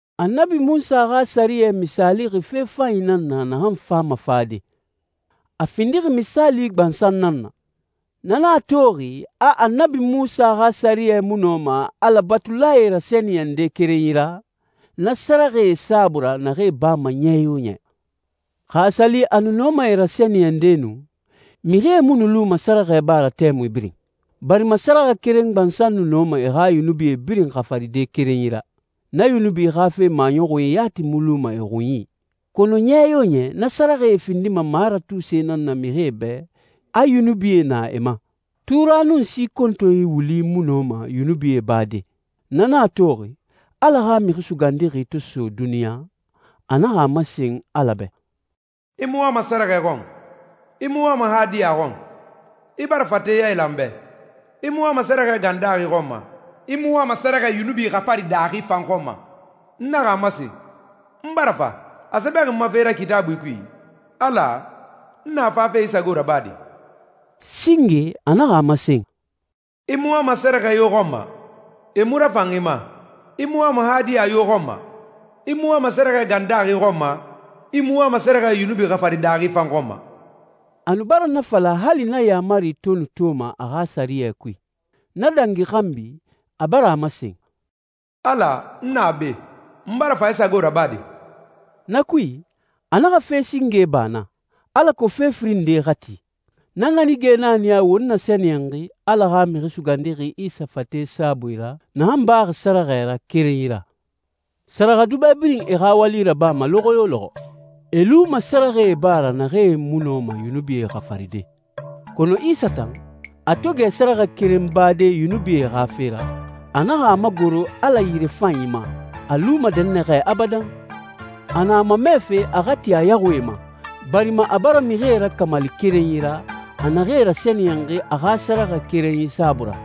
Annabi Munsa xa sɛriyɛ misaalixi fe fanyi nan na naxan fama fade. A findixi misaali gbansan nan na. Na nan a toxi a Annabi Munsa xa sɛriyɛ mu nɔma Ala batulae rasɛniyɛnde kerenyi ra, na sɛrɛxɛe saabui ra naxee bama ɲɛ yo ɲɛ. Xa a sa li a nu nɔma e rasɛniyɛnde nu, mixie mu nu luma sɛrɛxɛe ba ra tɛmui birin, barima sɛrɛxɛ keren gbansan nu nɔma e xa yunubi birin xafaride kerenyi ra, na yunubi xa fe maɲɔxunyi yati mu luma e xunyi. Kɔnɔ ɲɛ yo ɲɛ na sɛrɛxɛe findima maratuse nan na mixie bɛ a yunubie na e ma. Tura nun si kontonyi wuli mu nɔma yunubie bade. Na nan a toxi, Ala xa Mixi Sugandixi to so duniɲa, a naxa a masen Ala bɛ, «I mu wama sɛrɛxɛ xɔn. I mu wama hadiya xɔn. I bara fate yailan n bɛ. I mu wama sɛrɛxɛ gan daaxi xɔn ma, i mu wama sɛrɛxɛ yunubi xafari daaxi fan xɔn ma. N naxa a masen, ‹N bara fa. A sɛbɛxi n ma fe ra Kitaabui kui, Ala, n na fafe i sago rabade.›» Singe a naxa a masen, «I mu wama sɛrɛxɛ yo xɔn ma. E mu rafan i ma. I mu wama hadiya yo xɔn ma. I mu wama sɛrɛxɛ gan daaxi xɔn ma, i mu wama sɛrɛxɛ yunubi xafari daaxi fan xɔn ma.» A nu bara na fala hali na yaamari to nu toma a xa sɛriyɛ kui. Na dangi xanbi, a bara a masen, «Ala, n na be. N bara fa i sago rabade.» Na kui, a naxa fe singe ba na, alako fe firin nde xa ti. Na ɲanige nan a niyaxi won nasɛniyɛnxi Ala xa Mixi Sugandixi Isa fate saabui ra, naxan baxi sɛrɛxɛ ra kerenyi ra. Sɛrɛxɛdubɛ birin e xa wali rabama lɔxɔ yo lɔxɔ. E luma sɛrɛxɛe ba ra naxee mu nɔma yunubie xafaride. Kɔnɔ Isa tan, a to gɛ sɛrɛxɛ keren bade yunubie xa fe ra, a naxa a magoro Ala yirefanyi ma, a luma dɛnnaxɛ abadan. A na a mamɛfe a xa ti a yaxuie ma, barima a bara mixie rakamali kerenyi ra, a naxee rasɛniyɛnxi a xa sɛrɛxɛ kerenyi saabui ra.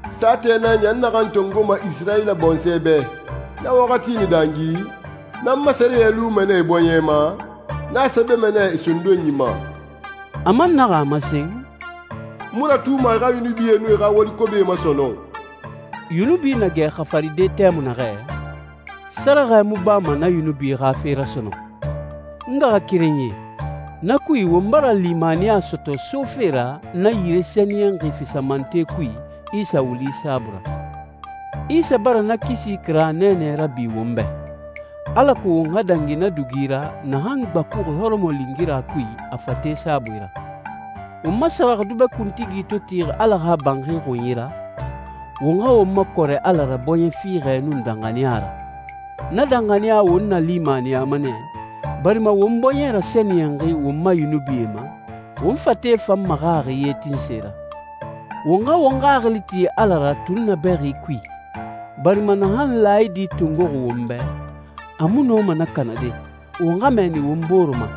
«Saatɛ nan ya n naxan tongoma Isirayila bɔnsɔɛ bɛ: Na waxati na dangi, n nan n ma sɛriyɛ luma nɛ e bɔɲɛ ma, n na sɛbɛma nɛ e sondonyi ma.» A man naxa a masen, «N mu ratuma e xa yunubie nun e xa wali kobie ma sɔnɔn.» Yunubi na gɛ xafaride tɛmui naxɛ, sɛrɛxɛ mu bama na yunubi xa fe ra sɔnɔn. N ngaxakerenyie, na kui won bara limaniya sɔtɔ sofe ra na yire sɛniyɛnxi fisamante kui Isa wuli saabui ra. Isa bara na kisi kira nɛɛnɛ rabi won bɛ, alako won xa dangi na dugi ra naxan gbakuxi hɔrɔmɔlingira kui a fate saabui ra. Won ma sɛrɛxɛdubɛ kuntigi to tixi Ala xa banxi xunyi ra, won xa won makɔrɛ Ala ra bɔɲɛ fiixɛ nun danxaniya ra. Na danxaniya won nalimaniyama nɛ, barima won bɔɲɛ rasɛniyɛnxi won ma yunubie ma, won fate fan maxaxi ye tinse ra. Won xa won xaxili ti Ala ra tunnabɛxi kui, barima naxan laayidi tongoxi won bɛ, a mu nɔma na kanade. Won xa mɛɛni won bore ma,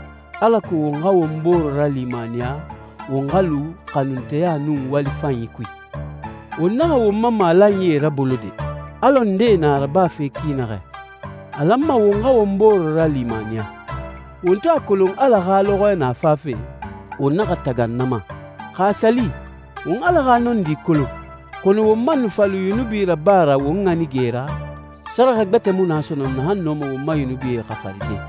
alako won xa won bore ralimaniya won xa lu xanunteya nun wali fanyi kui. Won naxa won ma malanyie rabolo de, alɔ ndee na a rabafe ki naxɛ. A lanma won xa won bore ralimaniya. Won to a kolon Ala xa lɔxɔɛ na fafe, won naxa tagan na ma. Xa a sa li, won Ala xa nɔndi kolon, kɔnɔ won man nu fa lu yunubi raba ra won ɲanige ra, sɛrɛxɛ gbɛtɛ mu na sɔnɔn naxan nɔma won ma yunubie xafaride,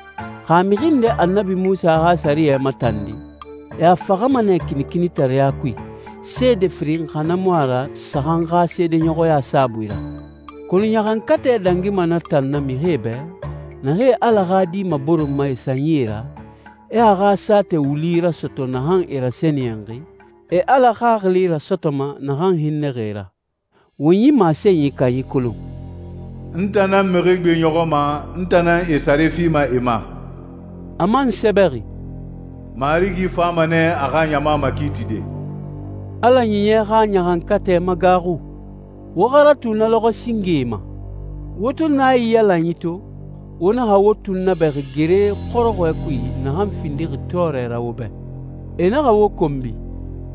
Xa mixi nde Annabi Munsa xa sɛriyɛ matandi, e a faxama nɛ kinikinitareɲa kui, seede firin xa na mu a ra saxan xa seedeɲɔxɔya saabui ra. Kɔnɔ ɲaxankatɛ dangima na tan na mixie bɛ, naxee Ala xa Di maboronma e sanyi ra, e a xa saatɛ wuli rasɔtɔ naxan e rasɛniyɛnxi, e Ala Xaxili rasɔtɔma naxan hinnɛxi e ra. Won yi masenyi kanyi kolon, «N tan nan mixi gbeɲɔxɔma, n tan nan e sare fima e ma.» A man sɛbɛxi, «Marigi fama nɛ a xa ɲama makiitide.» Ala Ɲiɲɛ xa ɲaxankatɛ magaaxu. Wo xa ratu na lɔxɔɛ singee ma. Wo to naiyalanyi to, wo naxa wo tunnabɛxi gere xɔrɔxɔɛ kui naxan findixi tɔɔrɛ ra wo bɛ. E naxa wo konbi,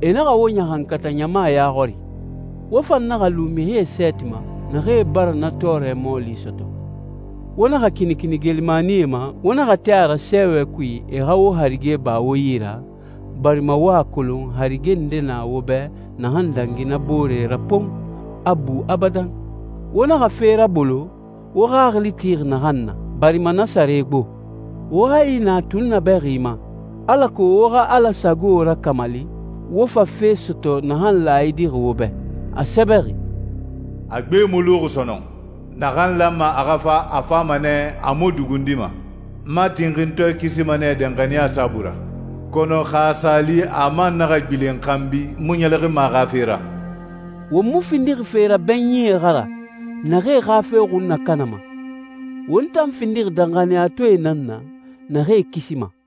e naxa wo ɲaxankata ɲama ya xɔri. Wo fan naxa lu mixie sɛɛti ma, naxee bara na tɔɔrɛ mɔɔli sɔtɔ. Wo naxa kinikini geelimanie ma, wo naxa tin a ra sɛɛwɛ kui e xa wo harige ba wo yi ra, barima wo a kolon harige nde na wo bɛ naxan dangi na boore ra pon, a bu abadan. Wo naxa fe rabolo, wo xaxili tixi naxan na, barima na sare gbo. Wo hayi na tunnabɛxi ma, alako wo xa Ala sago rakamali, wo fa fe sɔtɔ a naxan laayidixi wo bɛ. A sɛbɛxi, «A gbe mu luxi sɔnɔn. Naxan lanma a xa fa, a fama nɛ, a mu dugundima. N ma tinxintɔɛ kisima nɛ danxaniya saabui ra. Kɔnɔ xa a sa li a man naxa gbilen xanbi, n mu ɲɛlɛxinma a xa fe ra.» Won mu findixi fe rabɛɲinyie xa ra, naxee xa fe xun nakanama. Won tan findixi danxaniyatɔɛe nan na, naxee kisima.